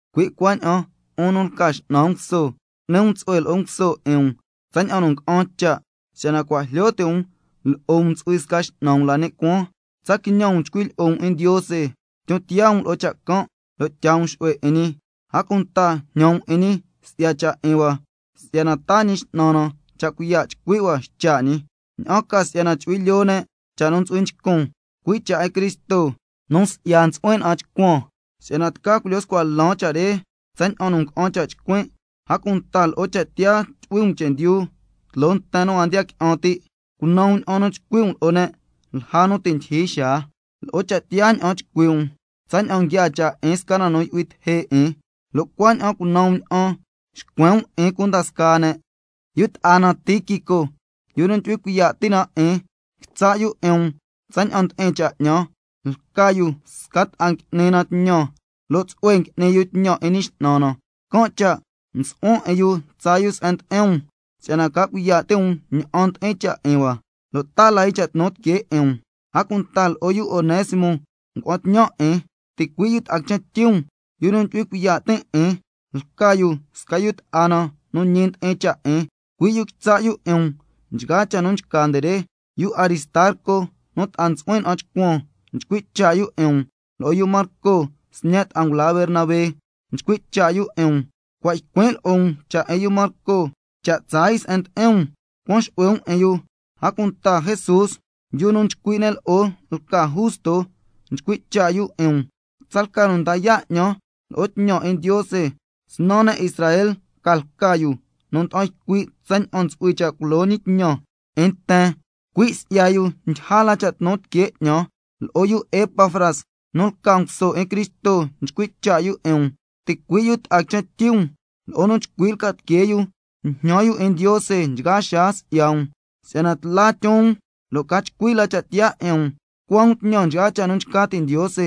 Cui' cuaña'an 'un nu lca x'nan nguso, cu'ni um tsu'hue lo'o nguso 'in um tsaña'an nu nga'an cha', si'yana cua' jlyo ti' um lo'o um ntsu'hui sca X'nan um la ni' cuaan. Tsa quiñan um chcui' lyi'o um 'in Ndiose, tyon tiyaa um lo'o cha' can' lo' tyaa um xu'hue 'in ñi. A cunta jñan um 'in ñi si'ya cha' 'in hua, si'yana taa Ñi X'nan na cha' cuiya' chcui' hua ycha' ñi, ña'an ca si'yana chu'hui lyoo ne' cha' nu ntsu'hui nchcun, cui' cha' 'in Cristo, nu si'ya ntsu'huin na'an chcuan, si'yana tca culyo scua lan cha' re tsaña'an nu nga'an cha' chcuin'. A cunta lo'o cha' tiyaa tyu'hui um chendyu tloo nten nu a ndiya qui'an ti', cunan um ña'an nu chcui' um lo'o ne' lja nu ti' ndyijyi xaa. Lo'o cha' tiyaa ña'an chcui' um, tsaña'an nguiaa cha' 'in sca na nu yu'hui teje' 'in, lo' cuaña'an cunan um ña'an xcuen um 'in cunda scaa ne'. Yu ta'a na Tíquico, yu nu ndyu'hui cuiya' ti' na 'in, quitsa' yu 'in um tsaña'an ndi'in cha' 'ñan, lca yu sca ta'a ngui'ni na tñan lo' tsu'hue ngui'ni yu tñan 'in Ñi X'nan na. Can' cha' msu'huan 'in yu tsaa yu se'en ndi'in um si'yana ca cuiya' ti' um ña'an ndi'in cha' 'in hua, lo' taa la yu cha' tnu tiquee 'in um, a cunta lo'o yu Onésimo ngua'an tñan 'in, ticui' yu ta'a quichen tyi um, yu nu ndyu'hui cuiya' tin' 'in, lca yu sca yu ta'a na nu ñi ndi'in cha' 'in, cui' yu quitsa' yu 'in um nchgaa cha' nu nchca nde re. Yu Aristarco nu ta'a ntsu'huin na'an chcuan, nchcui' cha' yu 'in um. Lo'o yu Marco sñe' ta'a ngula Bernabé nchcui' cha' yu 'in um, cua' ycuin' lo'o um cha' 'in yu Marco, cha' tsaa yu se'en ndi'in um cuan xu'hue um 'in yu, a cunta Jesús, yu nu nchcui' ne' lo'o lca Justo, nchcui' cha' 'in um, lo' tsalca nu nda yaa' 'ñan lo'o tñan 'in Ndiose snan ne' Israel ca lca yu nu nda'an ycui' tsaña'an ntsu'hui cha' culo ñi tñan 'in nten, cui' si'ya yu ndyija la cha' tnu tiquee 'ñan. Lo'o yu Epafras nu lca nguso 'in Cristo nchcui' cha' yu 'in um, ticui' yu ta'a quichen tyi um. Lo'o nu chcui lca tiquee yu njñan yu 'in Ndiose nchgaa xaa si'ya um, si'yana tla tyon um lo' ca chcui la cha' tiyaa 'in um, tucua um tñan nchgaa cha' nu nchca ti' Ndiose.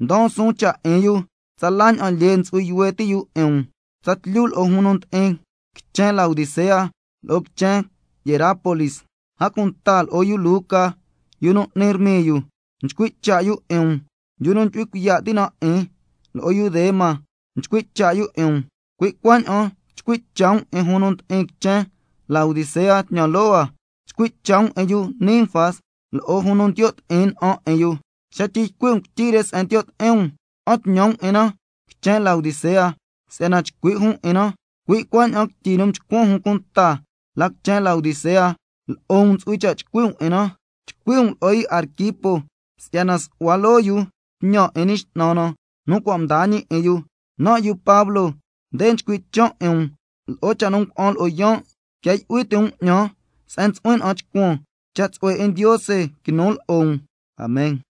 Ndaan suun cha' 'in yu tsala ña'an lyee ntsu'hui yuhue ti' yu 'in um, tsatlyu lo'o jun nu ndi'in quichen Laodicea lo'o quichen Hierápolis. A cunta lo'o yu Luca, yu nu n'ni rmiyu, nchcui' cha' yu 'in um, yu nu ndyu'hui cuiya' ti' na 'in. Lo'o yu Demas nchcui' cha' yu 'in um. Cui' cuaña'an chcui' cha' um 'in jun nu ndi'in quichen Laodicea tñan loo hua, chcui' cha' um 'in yu Ninfas lo'o jun nu ndiyo' ti'in na'an 'in yu. Xa tyi ycui' um quityi re se'en ndiyo' ti'in um, ca'an tñan um 'in na quichen Laodicea si'yana chcui' jun 'in na. Cui' cuaña'an quityi nu mchcuan jun cunta la quichen Laodicea, lo'o um ntsu'hui cha' chcui' um 'in na. Chcui' um lo'o yu Arquipo si'yana su'hua loo yu tñan 'in Ñi X'nan na nu cua' mdaa ñi 'in yu. Nan' yu Pablo, nde nchcui' chan' 'in um lo'o cha' nu ngua'an lo'o yaan'. Quia yu'hui ti' um 'ñan se'en ntsu'huin na'an chcuan. Cha' tsu'hue 'in Ndiose quinu lo'o um. Amen.